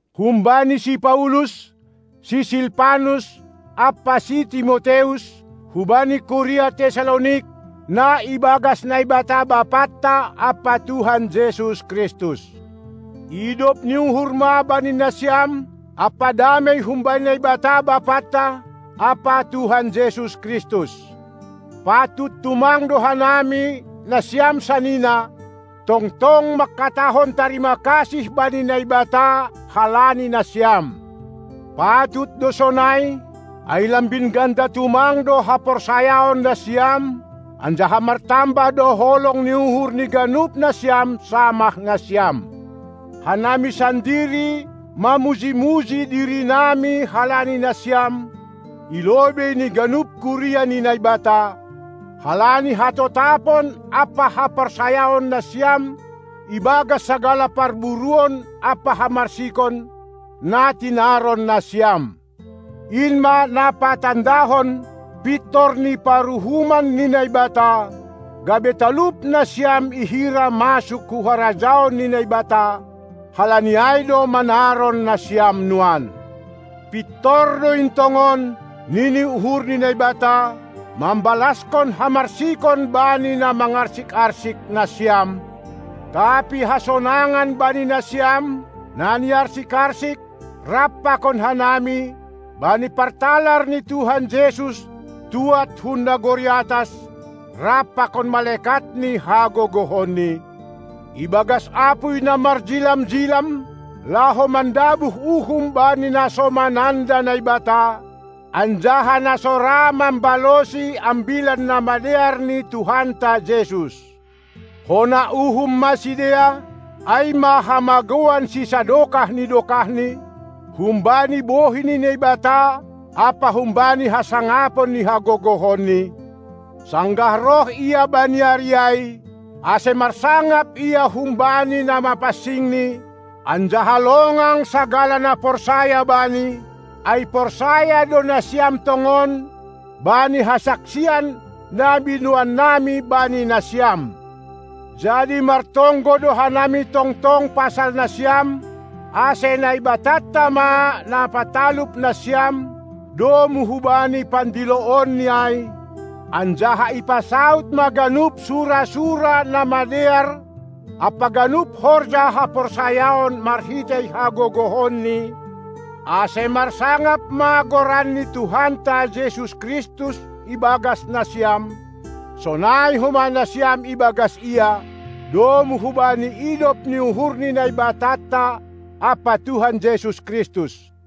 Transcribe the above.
Humbani si Paulus, si Silpanus, ampa si Timoteus, hubani kuria Tessalonik, na ibagas Naibata Bapanta ampa Tuhan Jesus Kristus. Idop ni uhur ma bani nasiam ampa damei humbani Naibata Bapanta ampa Tuhan Jesus Kristus. Patut tumang do hanami, nasiam sanina, tongtong mangkatahon tarima kasih bani Naibata halani nasiam. Patut do sonai, ai lambin ganda tumang do haporsayaon nasiam, anjaha martambah do holong ni uhur ni ganup nasiam samah nasiam. Hanami sandiri mamuji-muji dirinami halani nasiam i lobei ni ganup kuria ni Naibata, halani hatotapon ampa haporsayaon nasiam ibagas sagala parburuon ampa hamarsikon, na tinaron nasiam. In ma na patandahon pintor ni paruhuman ni Naibata, gabe talup nasiam ihira masuk hu harajaon ni Naibata; halani ai do manaron nasiam nuan. Pintor do in tongon, nini uhur ni Naibata, mambalaskon hamarsikon bani na mangarsik-arsik nasiam, tapi hasonangan bani nasiam, na niarsik-arsik, rap pakon hanami, bani partalar ni Tuhan Jesus tuad hun nagori atas rap pakon malekat ni hagogohonNi, ibagas apuy na marjilam-jilam, laho mandabuh uhum bani na so mananda Naibata, anjaha na so ra mambalosi Ambilan Namadear ni Tuhanta Jesus. Hona uhum ma sidea, ai ma hamagouan sisadokah ni dokahni, humbani bohi ni Naibata ampa humbani hasangapon ni hagogohonNi, sanggah roh Ia bani ari ai, ase marsangap Ia humbani na mapansingNi anjaha longang sagala na porsaya bani, ai porsaya do nasiam tongon bani hasaksian na binoannami bani nasiam. Jadi martonggo do hanami tongtong pasal nasiam, ase Naibatanta ma na patalup nasiam domu hubani pandiloonNi ai, anjaha ipasaud ma ganup sura-sura na madear ampa ganup horja haporsayaon marhitei hagogohonNi, ase marsangap ma goran ni Tuhanta Jesus Kristus ibagas nasiam, sonai homa nasiam ibagas Ia, domu hubani idop ni uhur ni Naibatanta ampa Tuhan Jesus Kristus.